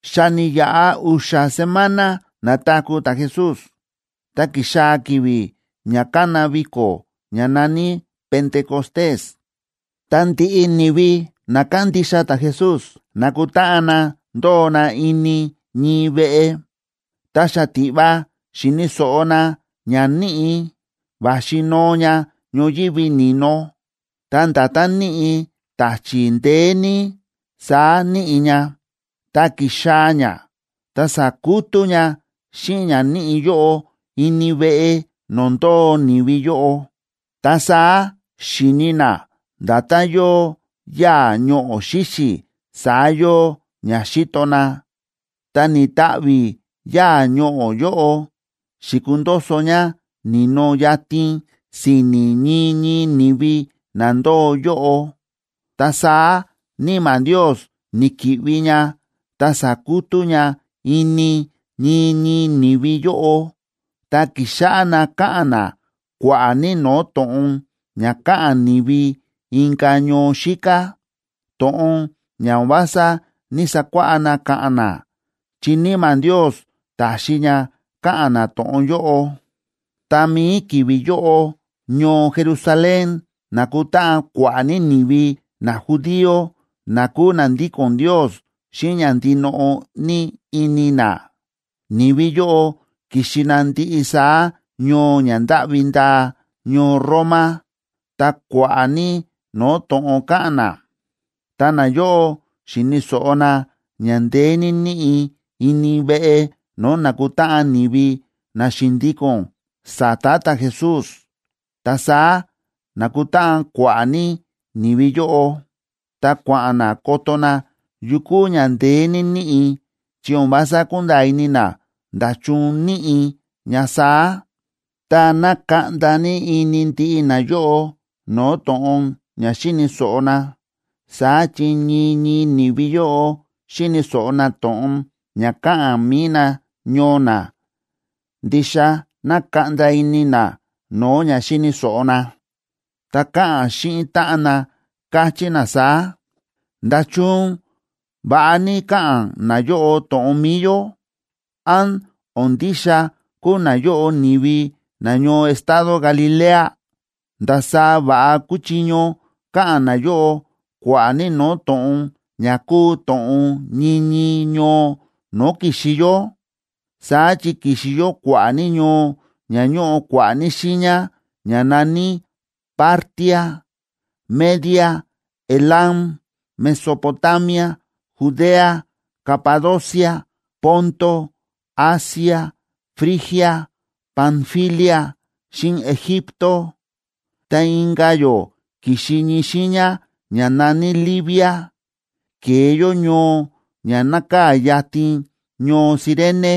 Xa ni̱yaꞌa u̱xa̱ semana na̱taku̱ ta̱Jesús, ta ki̱xaa̱ ki̱vi̱ ña kána viko̱ ña na̱ní Pentecostés.a Ta ndiꞌi ni̱vi na kándixa ta̱Jesús na̱kutáꞌan na ndóo na ini ñii veꞌe. Ta xatiꞌva xi̱ni̱ so̱ꞌo na ña níꞌi̱, va̱xi noo ña ñoyívi ni̱no. Ta nda̱tán níꞌi̱ ta̱chi̱ ndeé ní, saá níꞌi̱ ña. Tá ki̱xaa̱ ña, ta sa̱kutú ña xíꞌin ña níꞌi̱ yóꞌo ini veꞌe no̱o̱ ndóo ni̱vi yóꞌo. Ta saá xi̱ni na nda̱tán yóo yáa̱ ñoꞌo̱ xíxi̱, saá yóo ña xíto na. Ta ni̱ta̱ꞌvi̱ yáa̱ ñoꞌo̱ yóꞌo, xi̱kundoso ña ni̱no yatin si̱ni̱ ñii ñii ni̱vi na ndóo yóꞌo. Ta saá Níma̱ Ndios, ni̱ki̱ꞌvi ña ta sa̱kutú ña ini ñii ñii ni̱vi yóꞌo, ta ki̱xáꞌá na káꞌa̱n na kua̱ꞌa̱ ní no̱o̱ to̱ꞌon ña káꞌa̱n ni̱vi inka̱ ñoo xíká, to̱ꞌon ña o̱n vása ní‑sakuáꞌá na káꞌa̱n na, chi Níma̱ Ndios ta̱xi ña káꞌa̱n na to̱ꞌon yóꞌo. Ta mi̱i ki̱vi̱ yóꞌo, ñoo Jerusalén na̱kutáꞌan kua̱ꞌa̱ ní ni̱vi najudío na kúu na ndíko̱n Ndios xíꞌin ña ndinoꞌo ní ini na. Ni̱vi yóꞌo ki̱xi na ndiꞌi saá ñoo ña ndáꞌvi ndaa ñoo Roma, ta kua̱ꞌa̱ ní no̱o̱ to̱ꞌon káꞌa̱n na. Tá nayóꞌo xi̱ni̱ so̱ꞌo na ña ndeé ní níꞌi̱ ini veꞌe no̱o̱ nákutáꞌan ni̱vi na xi̱ndíko̱n sa̱ta̱ ta̱Jesús, ta saá na̱kutáꞌan kua̱ꞌa̱ ní ni̱vi yóꞌo, ta kua̱ꞌa̱n na koto na yu kúu ña ndeé ní níꞌi̱, chi o̱n vása kúnda̱a̱ ini na nda̱chun níꞌi̱ ña saá. Ta nákaꞌnda ní ini ndiꞌi nayóꞌo no̱o̱ to̱ꞌon ña xíni̱ so̱ꞌo na, saá chi ñii ñii ni̱vi yóꞌo xíni̱ so̱ꞌo na to̱ꞌon ña káꞌa̱n mi̱i nañoo na. Ndixa nákaꞌnda ini na no̱o̱ ña xíni̱ so̱ꞌo na, ta káꞌa̱n xíꞌin táꞌan na, káchí na saá: ―¿Nda̱chun va̱ꞌa ní káꞌa̱n nayóꞌo to̱ꞌon mi̱i yó? ¿Án o̱n ndixa kúu nayóꞌo ni̱vi nañoo estado Galilea? ¿Ndasaá va̱ꞌa kúchiño ka̱ꞌa̱n nayóꞌo kua̱ꞌa̱ ní no̱o̱ to̱ꞌon ña kúu to̱ꞌon ñii ñii ñoo no̱o̱ ki̱xi yó? Saá chi ki̱xi yó kua̱ꞌa̱ ní ñoo ña ñóꞌo kua̱ꞌa̱ ní xiiña, ña na̱ní: Partia, Media, Elam, Mesopotamia, Judea, Capadocia, Ponto, Asia, Frigia, Panfilia, xíꞌin Egipto. Ta inka̱ yó ki̱xi ñii xiiña ña na̱ní Libia, ke̱e yó ñoo ña nákaa̱ yatin ñoo Cirene.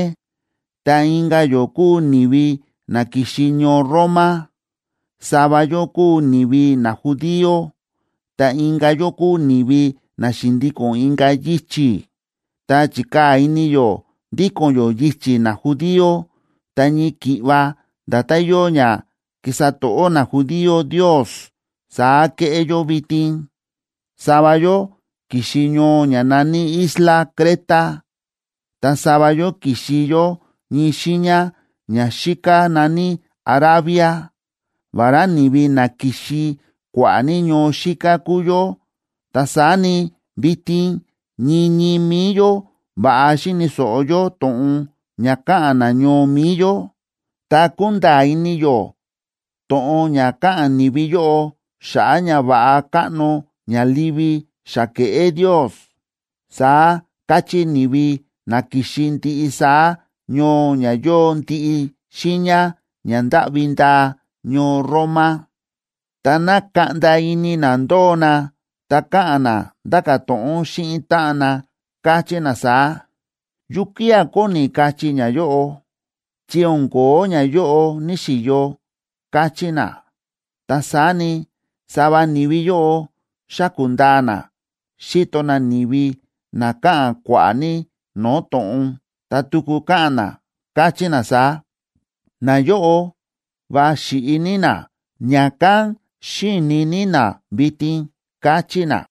Ta inka̱ yó kúu ni̱vi na ki̱xi ñoo Roma. Sava yó kúu ni̱vi najudío, ta inka̱ yó kúu ni̱vi na xi̱ndíko̱n inka̱ yichi̱, ta chi̱kaa̱ ini yó ndíko̱n yó yichi̱ najudío, ta ñii ki̱ꞌva nda̱tán yóo ña kísa to̱ꞌó najudío Ndios, saá kéꞌé yó vitin. Sava yó ki̱xi ñoo ña na̱ní isla Creta,b ta sava yó ki̱xi yó ñii xiiña ña xíká na̱ní Arabia. Vará ni̱vi na ki̱xi kua̱ꞌa̱ ní ñoo xíká kúu yó, ta saá ni, vitin ñii ñii mi̱i yó va̱ꞌa xíni̱ so̱ꞌo yó to̱ꞌon ña káꞌa̱n nañoo mi̱i yó, ta kúnda̱a̱ ini yó to̱ꞌon ña káꞌa̱n ni̱vi yóꞌo xa̱ꞌa̱ ñava̱ꞌa káꞌno ña livi xa ke̱ꞌé Ndios ―saá káchí ni̱vi na ki̱xi ndiꞌi saá ñoo ña yóo ndiꞌi xiiña ña ndáꞌvi ndaa ñoo Roma. Tá na̱kaꞌnda ini na ndóo na, ta káꞌa̱n na ndáka̱ to̱ꞌon xíꞌin táꞌan na, káchí na saá: ―¿Yukía̱ kóni kachí ñayóꞌo?, chi o̱n ko̱ó ñayóꞌo ní‑xiyo ―káchí na. Ta saá ni, sava ni̱vi yóꞌo xáku̱ ndaa na, xíto na ni̱vi na káꞌa̱n kua̱ꞌa̱ ní no̱o̱ to̱ꞌon, ta tuku káꞌa̱n na, káchí na saá: ―Nayóꞌo va xi̱ꞌi ní na, ña̱kán xíini ní na vitin ―káchí na.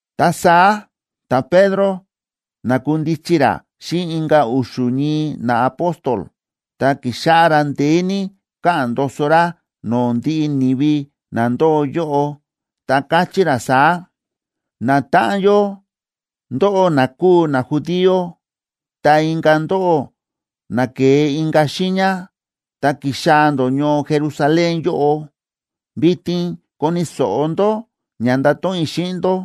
Ta saá ta̱Pedro na̱kundichi ra xíꞌin inka̱ u̱xu̱ ñii naapóstol, ta ki̱xáꞌá ra ndeé ní káꞌa̱n ndoso ra no̱o̱ ndiꞌi ni̱vi na ndóo yóꞌo, ta káchí ra saá: ―Natáꞌan yó, ndóꞌó na kúu najudío, ta inka̱ ndóꞌó na ke̱e inka̱ xiiña ta ki̱xaa̱ ndó ñoo Jerusalén yóꞌo, vitin koni̱ so̱ꞌo ndó ña ndato̱ꞌon i̱ xíꞌin ndó,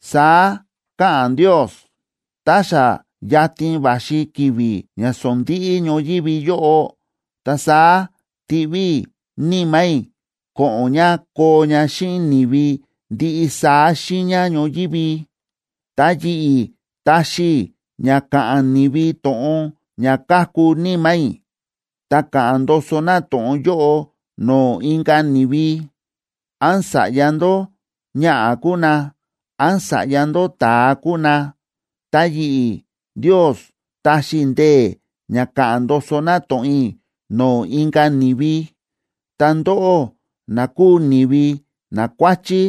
Saá káꞌa̱n Ndios: Tá xa yatin va̱xi ki̱vi̱ ña sondíꞌí ñoyívi yóꞌo, ta saá tiꞌví i̱ Níma̱ i̱ ko̱ꞌo̱n ña koo ña xíꞌin ni̱vi ndiꞌi saá xiiña ñoyívi. Ta yi̱ꞌi̱ taxi i̱ ña ka̱ꞌa̱n ni̱vi to̱ꞌon ña káku Níma̱ i̱, ta ka̱ꞌa̱n ndoso na to̱ꞌon yóꞌo no̱o̱ inka̱ ni̱vi. Án sa̱ꞌya ndó ñaꞌa̱ kúu ná, án sa̱ꞌya ndó ta̱a kúu na, ta yi̱ꞌi̱ Ndios taxi i̱ ndee̱ ña ka̱ꞌa̱n ndoso na to̱ꞌon i̱ no̱o̱ inka̱ ni̱vi. Ta ndóꞌó na kúu ni̱vi nakuáchí,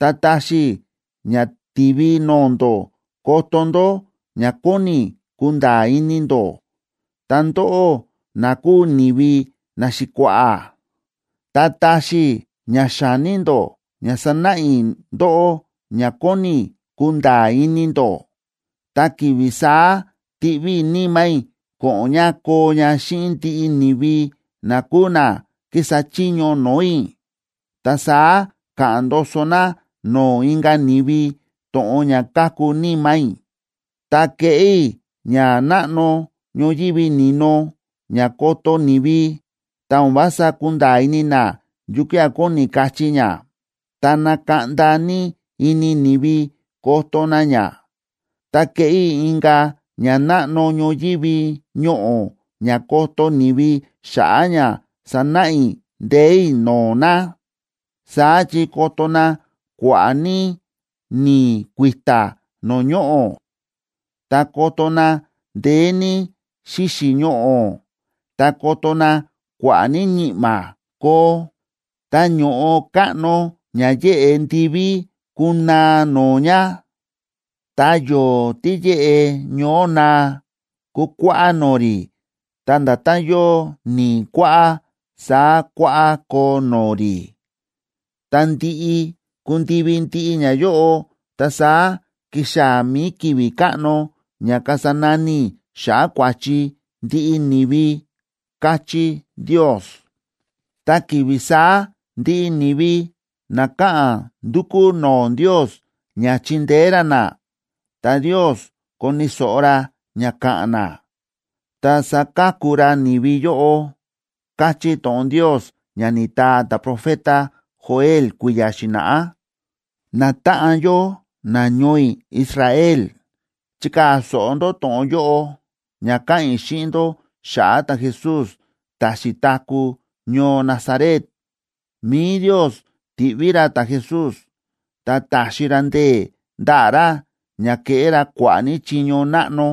ta taxi i̱ ña tivi no̱o̱ ndó koto ndó ña kóni i̱ kunda̱a̱ ini ndó. Ta ndóꞌó na kúu ni̱vi naxi̱kua̱ꞌa̱, ta taxi i̱ ña xa̱ní ndó ña sanáꞌa i̱ ndóꞌó ña kóni i̱ kunda̱a̱ ini ndó. Ta ki̱vi̱ saá tiꞌví i̱ Níma̱ i̱ ko̱ꞌo̱n ña koo ña xíꞌin ndiꞌi ni̱vi na kúu na kísa chiño no̱o̱ i̱, ta saá ka̱ꞌa̱n ndoso na no̱o̱ inka̱ ni̱vi to̱ꞌon ña káku Níma̱ i̱. Ta keꞌé i̱ ñanáꞌno ñoyívi ni̱no ña koto ni̱vi, ta o̱n vása kunda̱a̱ ini na yukía̱ kóni kachí ña, ta nakaꞌnda ní ini ni̱vi koto na ña. Ta keꞌé i̱ inka̱ ñanáꞌno ñoyívi ñoꞌo̱ ña koto ni̱vi xa̱ꞌa̱ ña sanáꞌa i̱ ndee̱ i̱ no̱o̱ na. Saá chi koto na kua̱ꞌa̱ ní ni̱i̱ kui̱ta̱ no̱o̱ ñoꞌo̱, ta koto na ndeé ní xíxi̱ ñoꞌo̱, ta koto na kua̱ꞌa̱ ní ñi̱ꞌma̱ koo. Ta ño̱ꞌo káꞌno ña yéꞌe ndiví kunaa no̱o̱ ña. Ta yo̱o̱ tí yéꞌe ñoó naa kukuáꞌá no̱o̱ rí, ta nda̱tán yóo ni̱i̱ kuáꞌá, saá kuáꞌá koo no̱o̱ rí. Tá ndi̱ꞌi ku̱ndivi ndiꞌi ñayóꞌo, ta saá kixaa̱ mi̱i ki̱vi̱ káꞌno ña kasa nani i̱ xa̱ꞌa̱ kua̱chi ndiꞌi ni̱vi, káchí Ndios. Ta ki̱vi̱ saá ndiꞌi ni̱vi na ka̱ꞌa̱n ndukú no̱o̱ Ndios ña chindeé ra na, ta Ndios koni̱ so̱ꞌo ra ña ka̱ꞌa̱n na, ta saka̱ku ra ni̱vi yóꞌo, káchí to̱ꞌon Ndios ña ni̱taa ta̱profeta Joel kui̱ya̱ xi̱na̱ꞌá. ’Natáꞌan yó nañoo i̱ Israel, chikaa̱ so̱ꞌo ndó to̱ꞌon yóꞌo ña ka̱ꞌa̱n i̱ xíꞌin ndó xa̱ꞌa̱ ta̱Jesús ta̱ xi̱taku̱ ñoo Nazaret. Mi̱i Ndios ti̱ꞌví ra ta̱Jesús, ta ta̱xi ra ndee̱ ndaꞌa̱ ra ña ke̱ꞌé ra kua̱ꞌa̱ ní chiño náꞌno,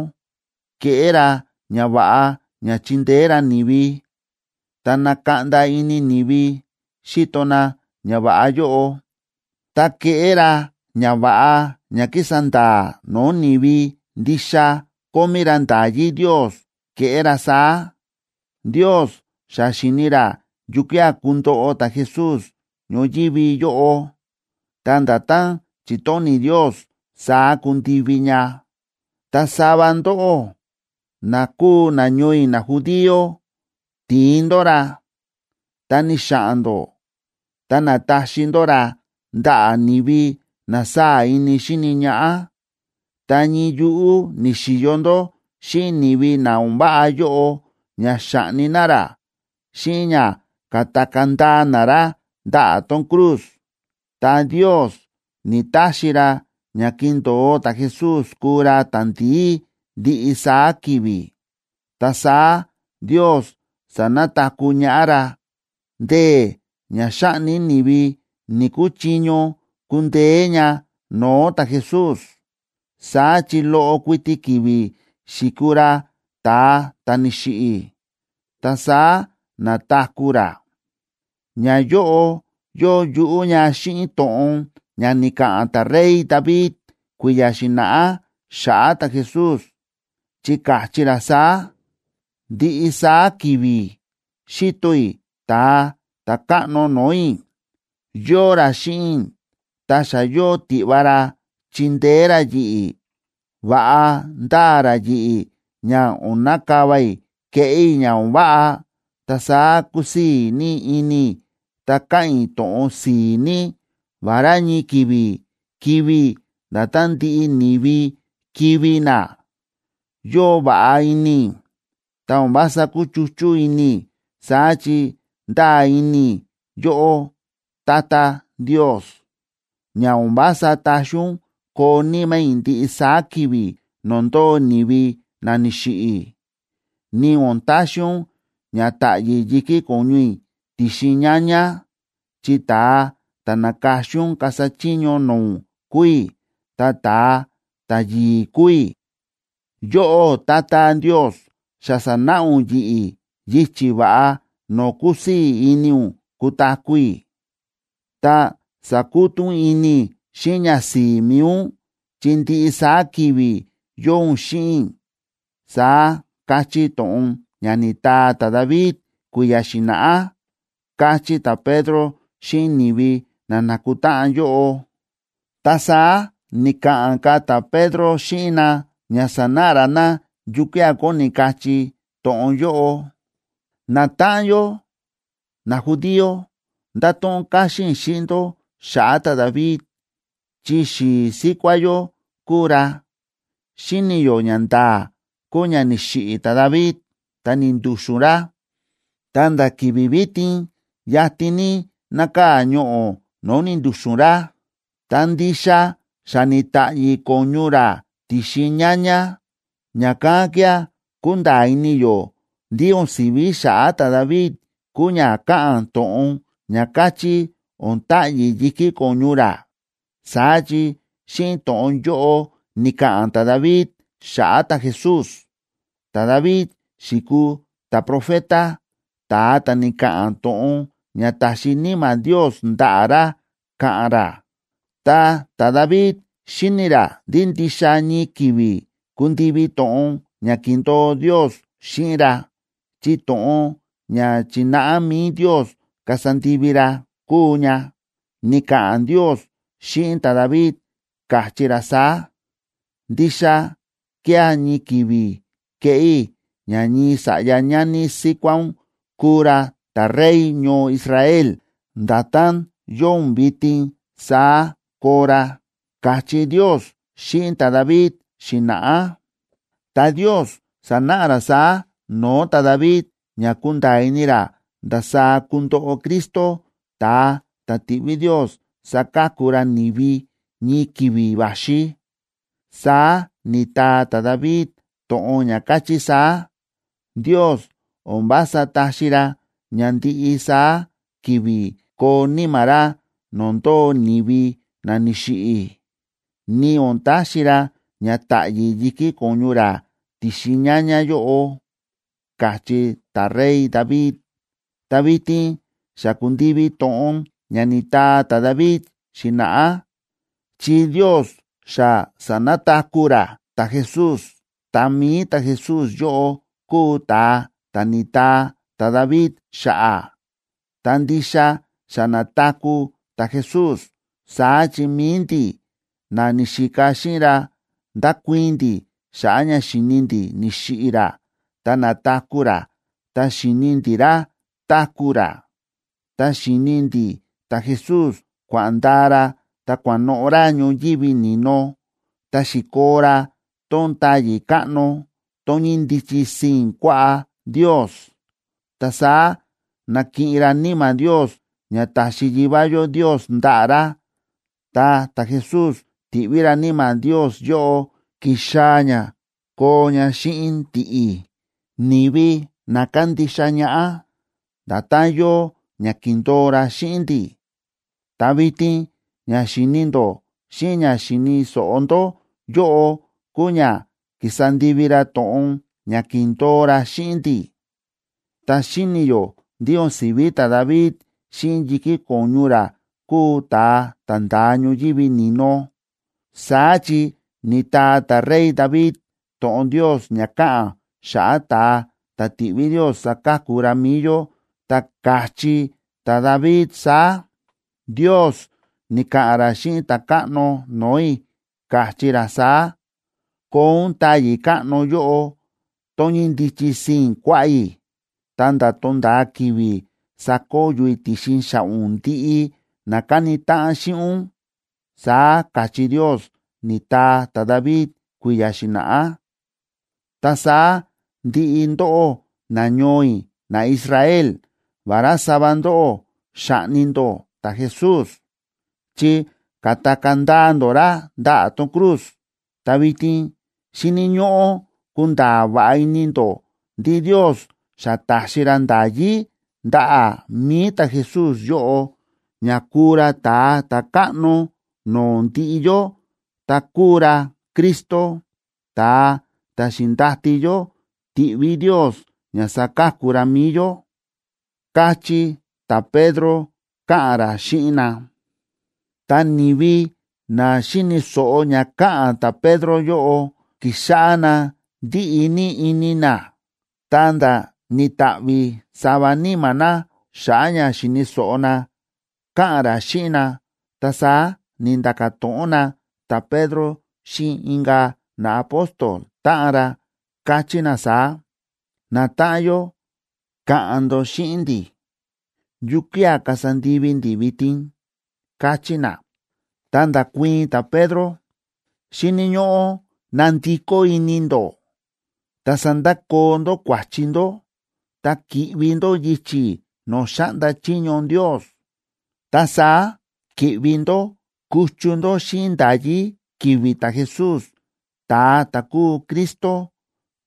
ke̱ꞌé ra ñava̱ꞌa ña chi̱ndeé ra ni̱vi, ta na̱kaꞌnda ini ni̱vi xi̱to na ñava̱ꞌa yóꞌo, ta ke̱ꞌé ra ñava̱ꞌa ña ki̱sa nda̱a̱ no̱o̱ ni̱vi ndixa kómí ra nda̱yí Ndios ke̱ꞌé ra saá. Ndios xa xi̱ni̱ ra yukía̱ kundoꞌo ta̱Jesús ñoyívi yóꞌo, ta nda̱tán chi̱tóni̱ Ndios, saá ku̱ndivi ña. Ta sava ndóꞌó, na kúu nañoo i̱ najudío ti̱in ndó ra, ta ni̱xa̱ꞌa̱n ndó, ta na̱taxi ndó ra ndaꞌa̱ ni̱vi na sáa̱ ini xíni ñaꞌá. Ta ñii yuꞌú ni̱xi̱yo ndó xíꞌin ni̱vi na o̱n váꞌa yóꞌo ña xa̱ꞌni na ra xíꞌin ña ka̱takaa̱ ndaa na ra ndaꞌa̱ tón cruz. Ta Ndios ni̱‑taxi ra ña kindo̱o ta̱Jesús kuu ra ta̱ndi̱í ndiꞌi saá ki̱vi̱, ta saá Ndios sa̱nataku̱ ñaꞌá ra. Ndee̱ ña xáꞌni ni̱vi ni̱‑kuchiño kundeé ña no̱o̱ ta̱Jesús, saá chi loꞌo kuiti ki̱vi̱ xi̱kuu ra ta̱a ta̱ ni̱xiꞌi̱, ta saá na̱taku̱ ra. Ñayóꞌo yóo yuꞌú ña xíꞌin to̱ꞌon ña ni̱ka̱ꞌa̱n ta̱rey David kui̱ya̱ xi̱na̱ꞌá xa̱ꞌa̱ ta̱Jesús, chi káchí ra saá: Ndiꞌi saá ki̱vi̱ xíto i̱ Ta̱a Ta̱káꞌno no̱o̱ i̱, yóo ra xíꞌin i̱, ta xa yóo tiꞌva ra chindeé ra yi̱ꞌi̱. Va̱ꞌa ndáa ra yi̱ꞌi̱ ña o̱n nakava i̱ keꞌé i̱ ña o̱n váꞌa. Ta saá kúsii̱ ní ini i̱ ta káꞌa̱n i̱ to̱ꞌon si̱i̱ ní. Vará ñii ki̱vi̱ kivi̱ i̱ nda̱tán ndiꞌi ni̱vi kivi̱ na, yóo va̱ꞌa ini i̱, ta o̱n vása kúchuchú ini i̱. Saá chi ndáa ini i̱ yóꞌó, Tata Ndios. Ña o̱n vása taxi ún koo níma̱ i̱ ndiꞌi saá ki̱vi̱ no̱o̱ ndóo ni̱vi na ni̱xiꞌi̱, ni o̱n taxi ún ña ta̱ꞌyi̱ yi̱kí ko̱ñu i̱ ti̱xin ñaña. Chi ta̱a ta̱ na̱ka̱xin ún kasa chiño no̱o̱ ún kúu i̱, ta ta̱a ta̱yi̱i̱ kúu i̱. Yóꞌó Tata Ndios, xa sa̱náꞌa ún yi̱ꞌi̱ yichi̱ va̱ꞌa no̱o̱ kúsii̱ ini ún kutaku̱ i̱. Ta sakutú ún ini i̱ xíꞌin ñasi̱i̱ mi̱i ún, chi ndiꞌi saá ki̱vi̱ yóo ún xíꞌin i̱, saá káchí to̱ꞌon ña ni̱taa ta̱David kui̱ya̱ xi̱na̱ꞌá ―káchí ta̱Pedro xíꞌin ni̱vi na na̱kutáꞌan yóꞌo. Ta saá ni̱ka̱ꞌa̱n ka̱ ta̱Pedro xíꞌin na ña sanáꞌa ra na yukía̱ kóni kachí to̱ꞌon yóꞌo: ―Natáꞌan yó, najudío, ndato̱ꞌon káxín i̱ xíꞌin ndó xa̱ꞌa̱ ta̱David chi xi̱i̱ síkuá yó kúu ra. Xíni̱ yó ñanda̱a̱ kúu ña ni̱xiꞌi̱ ta̱David ta ni̱ndu̱xu̱n ra. Ta nda̱ ki̱vi̱ vitin yatin ní nákaa̱ ñoꞌo̱ no̱o̱ ni̱ndu̱xu̱n ra, ta ndixa xa ni̱ta̱ꞌyi̱ ko̱ñu ra ti̱xin ñaña. Ña̱kán kía̱ kúnda̱a̱ ini yó ndí o̱n si̱ví xa̱ꞌa̱ ta̱David kúu ña káꞌa̱n to̱ꞌon ña káchí o̱n ta̱ꞌyi̱ yi̱kí ko̱ñu ra. Saá chi xíꞌin to̱ꞌon yóꞌo ni̱ka̱ꞌa̱n ta̱David xa̱ꞌa̱ ta̱Jesús. Ta̱David xi̱kuu ta̱profeta, ta̱a ta̱ ni̱ka̱ꞌa̱n to̱ꞌon ña ta̱xi Níma̱ Ndios ndaꞌa̱ ra ka̱ꞌa̱n ra. Ta ta̱David xíni̱ ra ndí ndixa ñii ki̱vi̱ kundivi to̱ꞌon ña ki̱ndo̱o Ndios xíꞌin ra, chi to̱ꞌon ña chi̱náꞌa mi̱i Ndios kasa ndivi ra kúu ña. Ni̱ka̱ꞌa̱n Ndios xíꞌin ta̱David, káchí ra saá: “Ndixa kía̱ ñii ki̱vi̱ keꞌé i̱ ña ñii sa̱ꞌya ñani síkuá ún kuu ra ta̱Rey ñoo Israel, nda̱tán yóo ún vitin saá koo ra”, káchí Ndios xíꞌin ta̱David xi̱na̱ꞌá. Ta Ndios sa̱náꞌa ra saá no̱o̱ ta̱David ña ku̱nda̱a̱ ini ra ndasaá kundoꞌo Cristo, ta̱a ta̱ tiꞌví Ndios saka̱ku ra ni̱vi ñii ki̱vi̱ va̱xi. Saá ni̱taa ta̱David to̱ꞌon ña káchí saá: Ndios o̱n vása taxi ra ña ndiꞌi saá ki̱vi̱ koo níma̱ ra no̱o̱ ndóo ni̱vi na ni̱xiꞌi̱, ni o̱n taxi ra ña ta̱ꞌyi̱ yi̱kí ko̱ñu ra ti̱xin ñaña yóꞌo, ka̱chí ta̱rey David. Ta vitin xa ku̱ndivi to̱ꞌon ña ni̱taa ta̱David xi̱na̱ꞌá, chi Ndios xa sa̱nataku̱ ra ta̱Jesús, ta mi̱i ta̱Jesús yóꞌo kúu ta̱a ta̱ ni̱taa ta̱David xa̱ꞌa̱. Ta ndixa xa na̱taku̱ ta̱Jesús, saá chi mi̱i ndi̱, na ni̱xika xíꞌin ra ndákuii̱n ndi̱ xa̱ꞌa̱ ña xi̱ni ndi̱ ni̱xiꞌi̱ ra ta na̱taku̱ ra, ta xi̱ni ndi̱ ra táku̱ ra. Ta xíni ndi̱ ta̱Jesús kua̱ꞌa̱n ndaa ra ta kua̱noꞌo̱ ra ñoyívi ni̱no, ta xi̱koo ra tón táyi̱ káꞌno, tón ñíndichi sii̱n kuaꞌá Ndios. Ta saá na̱kiꞌin ra Níma̱ Ndios ña ta̱xi Yivá yó Ndios ndaꞌa̱ ra, ta ta̱Jesús ti̱ꞌví ra Níma̱ Ndios yóꞌo ki̱xaa̱ ña koo ña xíꞌin ndi̱ꞌi̱, ni̱vi na kándixa ñaꞌá, nda̱tán yóo ña ki̱ndo̱o ra xíꞌin ndi̱. Ta vitin ña xíni ndó xíꞌin ña xíni̱ so̱ꞌo ndó yóꞌo kúu ña ki̱sa ndivi ra to̱ꞌon ña ki̱ndo̱o ra xíꞌin ndi̱. Ta xíni̱ yó ndí o̱n si̱ví ta̱David xíꞌin yi̱kí ko̱ñu ra kúu ta̱a ta̱ nda̱a ñoyívi ni̱no. Saá chi ni̱taa ta̱rey David to̱ꞌon Ndios ña káꞌa̱n xa̱ꞌa̱ ta̱a ta̱ tiꞌví Ndios saka̱ku ra mi̱i yó, ta ka̱chí ta̱David saá: Ndios ni̱ka̱ꞌa̱n ra xíꞌin Ta̱káꞌno no̱o̱ i̱, káchí ra saá: “Koo ún táyi̱ káꞌno yóꞌo, tón ñíndichi sii̱n kuaꞌá i̱, ta̱nda̱ tonda̱a ki̱vi̱ sakoyo i̱ ti̱xin xa̱ꞌa̱ ún ndiꞌi na káni táꞌan xíꞌin ún”, saá káchí Ndios, ni̱taa ta̱David kui̱ya̱ xi̱na̱ꞌá. ’Ta saá ndiꞌi ndóꞌó nañoo i̱ naIsrael, vará sava ndóꞌó xa̱ꞌni ndó ta̱Jesús, chi ka̱takaa̱ ndaa ndó ra ndaꞌa̱ tón cruz, ta vitin xíni̱ ñóꞌó kunda̱a̱ va̱ꞌa ini ndó ndí Ndios xa ta̱xi ra nda̱yí ndaꞌa̱ mi̱i ta̱Jesús yóꞌo ña kúu ra Ta̱a Ta̱káꞌno no̱o̱ ndiꞌi yó, ta kúu ra Cristo, ta̱a ta̱ xi̱ndati yó tiꞌví Ndios ña saka̱ku ra mi̱i yó ―káchí ta̱Pedro, káꞌa̱n ra xíꞌin na. Tá ni̱vi na xi̱ni̱ so̱ꞌo ña káꞌa̱n ta̱Pedro yóꞌo, ki̱xáꞌá na ndíꞌi ní ini na, ta̱nda̱ ni̱ta̱ꞌvi̱ sava níma̱ na xa̱ꞌa̱ ña xi̱ni̱ so̱ꞌo na káꞌa̱n ra xíꞌin na. Ta saá ni̱nda̱ka̱ to̱ꞌon na ta̱Pedro xíꞌin inka̱ naapóstol táꞌan ra, káchí na saá: ―Natáꞌan yó, ka̱ꞌa̱n ndó xíꞌin ndi̱, ¿yukía̱ kasa ndivi ndi̱ vitin? ―káchí na. Ta nda̱kuii̱n ta̱Pedro: ―Xíni̱ ñóꞌó ná ndikó ini ndó ta sandakoo ndó kua̱chi ndó ta ki̱ꞌvi ndó yichi̱ no̱o̱ xáꞌnda chiño Ndios. Ta saá ki̱ꞌvi ndó kuchu ndó xíꞌin nda̱yí ki̱vi̱ ta̱Jesús ta̱a ta̱ kúu Cristo.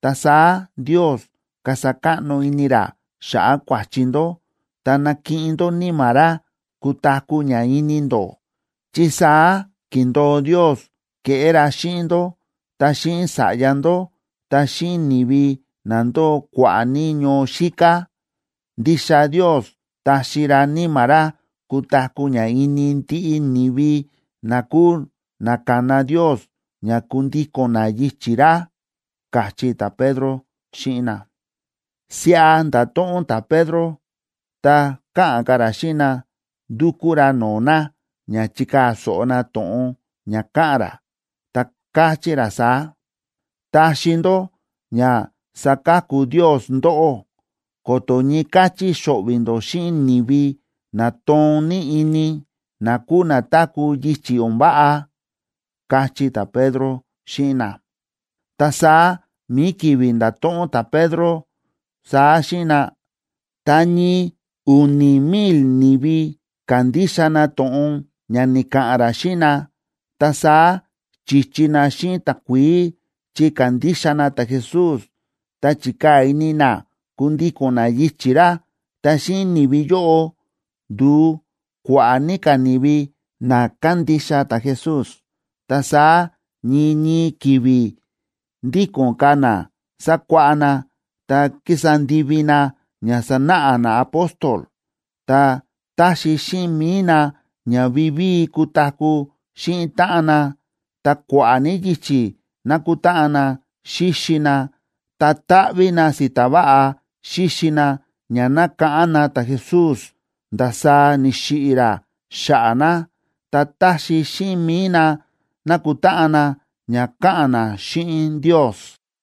Ta saá Ndios kasa káꞌno ini ra xa̱ꞌa̱ kua̱chi ndó ta nakiꞌin ndó Níma̱ ra kutaku̱ ña ini ndó, chi saá ki̱ndo̱o Ndios keꞌé ra xíꞌin ndó ta xíꞌin sa̱ꞌya ndó ta xíꞌin ni̱vi na ndóo kua̱ꞌa̱ ní ñoo xíká. Ndixa Ndios taxi ra Níma̱ ra kutaku̱ ña ini ndiꞌi ni̱vi na kúu na kana Ndios ña kundíko̱n na yichi̱ ra ―káchí ta̱Pedro xíꞌin na. Siꞌa nda̱to̱ꞌon ta̱Pedro, ta káꞌa̱n ka̱ ra xíꞌin na, ndúkú ra no̱o̱ na ña chikaa̱ so̱ꞌo na to̱ꞌon ña káꞌa̱n ra. Ta káchí ra saá: ―Taxi ndó ña saka̱ku Ndios ndóꞌó ko̱to̱ ñii káchí xo̱ꞌvi̱ ndó xíꞌin ni̱vi na toon ní ini, na kúu na táku̱ yichi̱ o̱n váꞌa ―káchí ta̱Pedro xíꞌin na. Ta saá mi̱i ki̱vi̱ nda̱to̱ꞌon ta̱Pedro saá xíꞌin na, ta ñii u̱ni̱ mil ni̱vi ka̱ndixa na to̱ꞌon ña ni̱ka̱ꞌa̱n ra xíꞌin na. Ta saá chi̱chi na xíꞌin takuií chi ka̱ndixa na ta̱Jesús, ta chi̱kaa̱ ini na kundíko̱n na yichi̱ ra. Ta xíꞌin ni̱vi yóꞌo, ndu̱u kua̱ꞌa̱ ní ka̱ ni̱vi na kándixa ta̱Jesús. Ta saá ñii ñii ki̱vi̱ ndíko̱n ka̱ na sákuáꞌá na ta kísa ndivi na ña sánáꞌa naapóstol, ta táxi xíꞌin mi̱i na ña vivíi kutaku̱ xíꞌin táꞌan na, ta kua̱ꞌa̱ ní yichi̱ nákutáꞌan na xíxi na, ta táꞌví na si̱ta̱ váꞌa xíxi na ña nákáꞌán na ta̱Jesús ndasaá ni̱xiꞌi̱ ra xa̱ꞌa̱ na, ta táxi xíꞌin mi̱i na nakutáꞌan na ña ka̱ꞌa̱n na xíꞌin Ndios.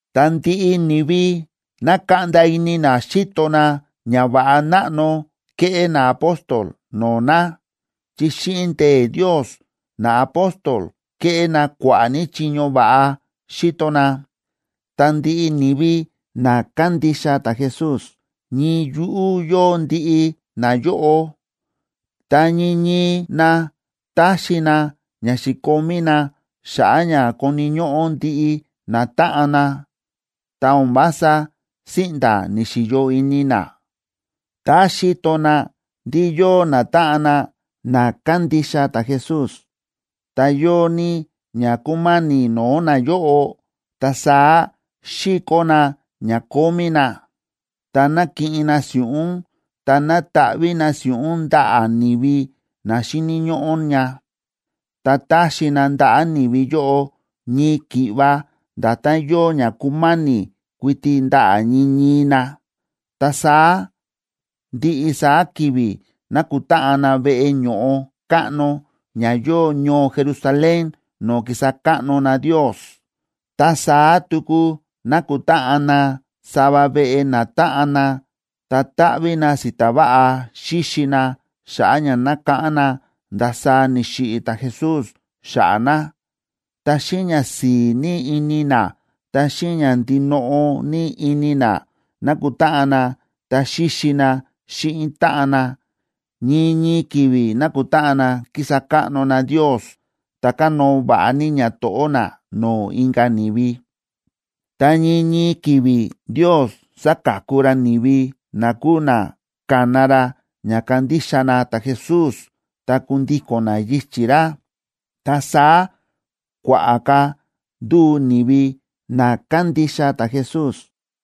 Ta ndiꞌi ni̱vi na̱kaꞌnda ini na xíto na ñava̱ꞌa náꞌno ke̱ꞌé naapóstol no̱o̱ na, chi xíꞌin ndee̱ Ndios naapóstol ke̱ꞌé na kua̱ꞌa̱ ní chiño va̱ꞌa xi̱to na. Ta ndiꞌi ni̱vi na kándixa ta̱Jesús ñii yuꞌú yóo ndiꞌi nayóꞌo. Ta ñii ñii na ta̱xi na ña xi̱komí na xa̱ꞌa̱ ña koni̱ ñóꞌó ndiꞌi natáꞌan na, ta o̱n vása síꞌnda̱ ni̱xi̱yo ini na. Tá xíto na ndí yóo natáꞌan na na kándixa ta̱Jesús, ta yóo ní ña kúma̱ni̱ no̱o̱ nayóꞌo, ta saá síkó na ña kómí na, ta nákiꞌin na si̱ꞌún, ta nátaꞌví na si̱ꞌún ndaꞌa̱ ni̱vi na xíni̱ ñóꞌó ña. Ta táxi na ndaꞌa̱ ni̱vi yóꞌo ñii ki̱ꞌva nda̱tán yóo ña kúma̱ni̱ kuiti ndaꞌa̱ ñii ñii na. Ta saá ndiꞌi saá ki̱vi̱ nákutáꞌan na veꞌe ño̱ꞌo káꞌno ña yóo ñoo Jerusalén no̱o̱ kísa káꞌno na Ndios. Ta saá tuku nákutáꞌan na sava veꞌe natáꞌan na, ta táꞌví na si̱ta̱ váꞌa xíxi na xa̱ꞌa̱ ña nákáꞌán na ndasaá ni̱xiꞌi̱ ta̱Jesús xa̱ꞌa̱ na. Ta xíꞌin ñasi̱i̱ ní ini na, ta xíꞌin ña ndinoꞌo ní ini na nákutáꞌan na ta xíxi na xíꞌin táꞌan na. Ñii ñii ki̱vi̱ nákutáꞌan na kísa káꞌno na Ndios, ta kánóo va̱ꞌa ní ñato̱ꞌó na no̱o̱ inka̱ ni̱vi. Ta ñii ñii ki̱vi̱ Ndios sa̱ka̱ku ra ni̱vi na kúu na ka̱na ra ña kandixa na ta̱Jesús ta kundíko̱n na yichi̱ ra. Ta saá kua̱ꞌa̱ ka̱ ndu̱u ni̱vi na kándixa ta̱Jesús.